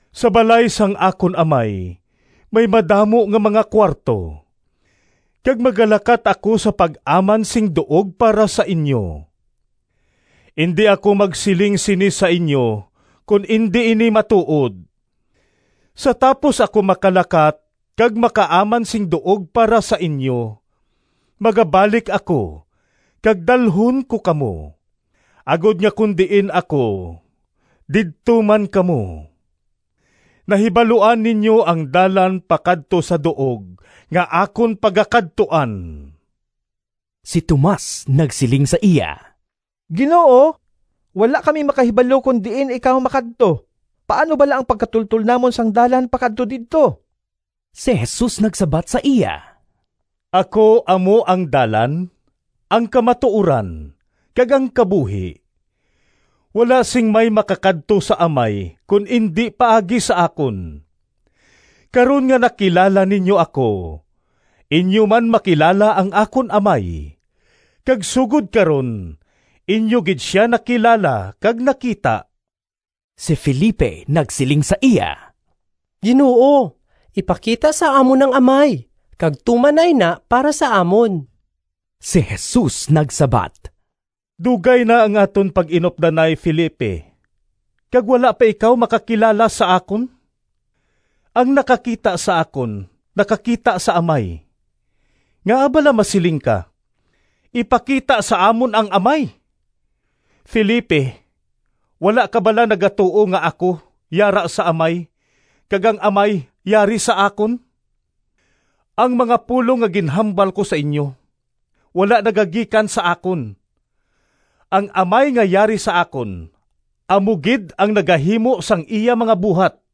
Sa balay sang akon Amay may madamo nga mga kuwarto, kag magalakat ako sa pag-aman sing duog para sa inyo. Indi ako magsiling sini sa inyo kon indi ini matuod. Sa tapos ako makalakat kag makaaman sing duog para sa inyo, magabalik ako kag dalhon ko kamo, agod nga kon diin ako didto man kamo. Nahibaluan ninyo ang dalan pakadto sa duog nga akon pagakadtuan.” Si Tomas nagsiling sa iya, “Ginoo, wala kami makahibalo kon diin ikaw makadto, paano bala ang pagkatultol namon sang dalan pakadto didto?” Si Jesus nagsabat sa iya, “Ako amo ang dalan, ang kamatuoran, kag ang kabuhi; wala sing may makakadto sa Amay kon indi paagi sa akon. Karon nga nakilala ninyo ako, inyo man makilala ang akon Amay, kag sugod karon inyo gid sia nakilala kag nakita.” Si Felipe nagsiling sa iya, “Ginoo, ipakita sa amon ang Amay, kag tuman na ina para sa amon.” Si Jesus nagsabat, “Dugay na ang aton pag-inupdanay, Felipe, kag wala pa ikaw makakilala sa akon? Ang nakakita sa akon nakakita sa Amay. Ngaa bala masiling ka, ‘Ipakita sa amon ang Amay’? Felipe, wala ka bala nagatuo nga ako yara sa Amay kag ang Amay yari sa akon? Ang mga pulong nga ginhambal ko sa inyo, wala nagagikan sa akon. Ang Amay nga yari sa akon amo gid ang nagahimo sang iya mga buhat.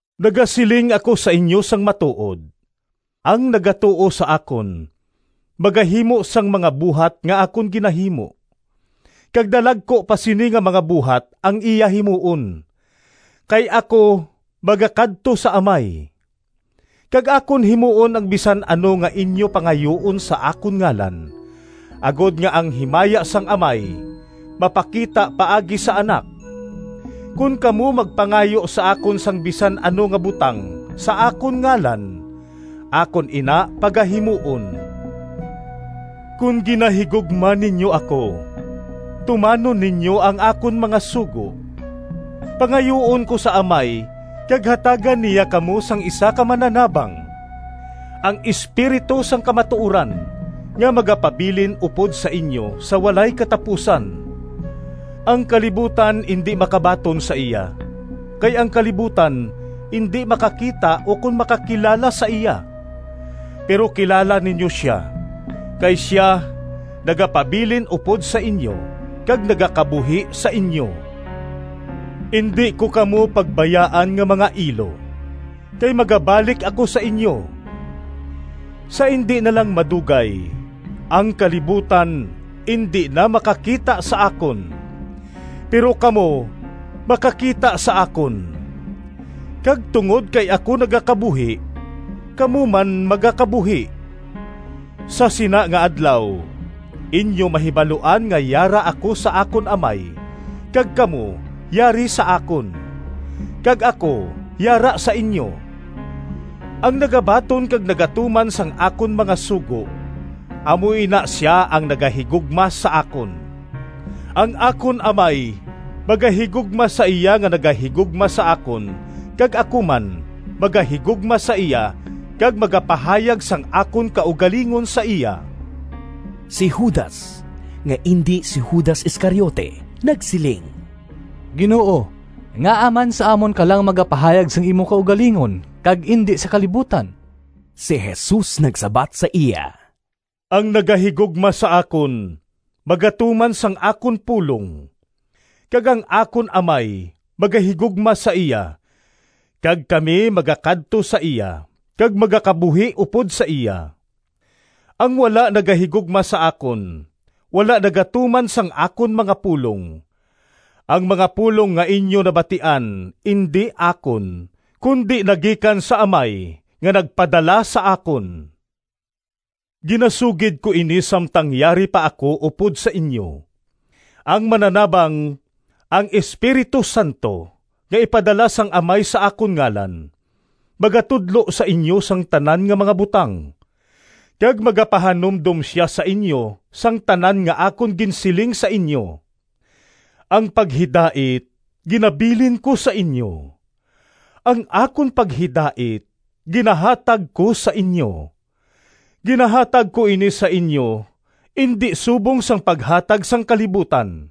Nagasiling ako sa inyo sang matuod: ang nagatuo sa akon magahimo sang mga buhat nga akon ginahimo, kag dalagku pa sini nga mga buhat ang iya himuon, kay ako magakadto sa Amay. Kag akon himuon ang bisan ano nga inyo pangayuon sa akon ngalan, agod nga ang himaya sang Amay mapakita paagi sa Anak. Kon kamo magpangayo sa akon sang bisan ano nga butang sa akon ngalan, akon ina pagahimuon.” “Kon ginahigugma ninyo ako, tumanon ninyo ang akon mga sugo. Pangayuon ko sa Amay kag hatagan niya kamo sang isa ka Mananabang, ang Espiritu sang kamatuoran, nga magapabilin upod sa inyo sa walay katapusan. Ang kalibutan indi makabaton sa iya, kay ang kalibutan indi makakita ukon makakilala sa iya. Pero kilala ninyo sia, kay sia nagapabilin upod sa inyo kag nagakabuhi sa inyo. “Indi ko kamo pagbayaan nga mga ilo, kay magabalik ako sa inyo. Sa indi na lang madugay, ang kalibutan indi na makakita sa akon, pero kamo makakita sa akon; kag tungod kay ako nagakabuhi, kamo man magakabuhi. Sa sina nga adlaw, inyo mahibaluan nga yara ako sa akon Amay kag kamo yari sa akon, kag ako yara sa inyo. “Ang nagabaton kag nagatuman sang akon mga sugo amo ina sia ang nagahigugma sa akon. Ang akon Amay magahigugma sa iya nga nagahigugma sa akon, kag ako man magahigugma sa iya kag magapahayag sang akon kaugalingon sa iya.” Si Judas (nga indi si Judas Iscariote) nagsiling, “Ginoo, ngaa man sa amon ka lang magapahayag sang imo kaugalingon kag indi sa kalibutan?” Si Jesus nagsabat sa iya, “Ang nagahigugma sa akon magatuman sang akon pulong, kag ang akon Amay magahigugma sa iya kag kami magakadto sa iya kag magakabuhi upod sa iya. Ang wala nagahigugma sa akon, wala nagatuman sang akon mga pulong. Ang mga pulong nga inyo nabatian indi akon, kundi nagikan sa Amay nga nagpadala sa akon. “Ginasugid ko ini samtang yari pa ako upod sa inyo. Ang Mananabang, ang Espiritu Santo nga ipadala sang Amay sa akon ngalan, magatudlo sa inyo sang tanan nga mga butang, kag magapahanumdom sia sa inyo sang tanan nga akon ginsiling sa inyo. “Ang paghidait ginabilin ko sa inyo, ang akon paghidait ginahatag ko sa inyo. Ginahatag ko ini sa inyo indi subong sang paghatag sang kalibutan.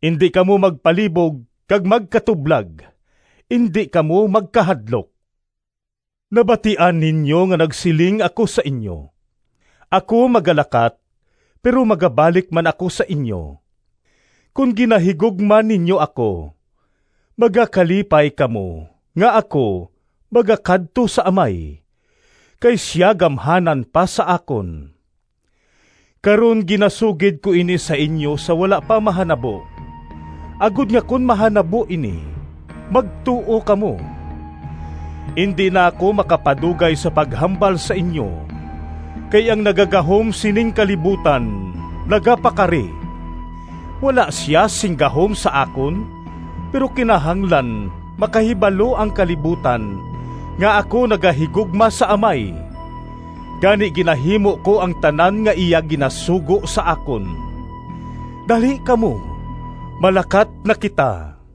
Indi kamo magpalibog kag magkatublag, indi kamo magkahadlok. Nabatian ninyo nga nagsiling ako sa inyo, ‘Ako magalakat, pero magabalik man ako sa inyo.’ Kon ginahigugma ninyo ako, magakalipay kamo nga ako magakadto sa Amay, kay sia gamhanan pa sa akon. Karon ginasugid ko ini sa inyo sa wala pa mahanabo, agod nga kon mahanabo ini, magtuo kamo. Indi na ako makapadugay sa paghambal sa inyo, kay ang nagagahom sining kalibutan nagapakari. Wala sia sing gahom sa akon, pero kinahanglan makahibalo ang kalibutan nga ako nagahigugma sa Amay. Gani ginahimo ko ang tanan nga iya ginasugo sa akon. “Dali kamo, malakat na kita.”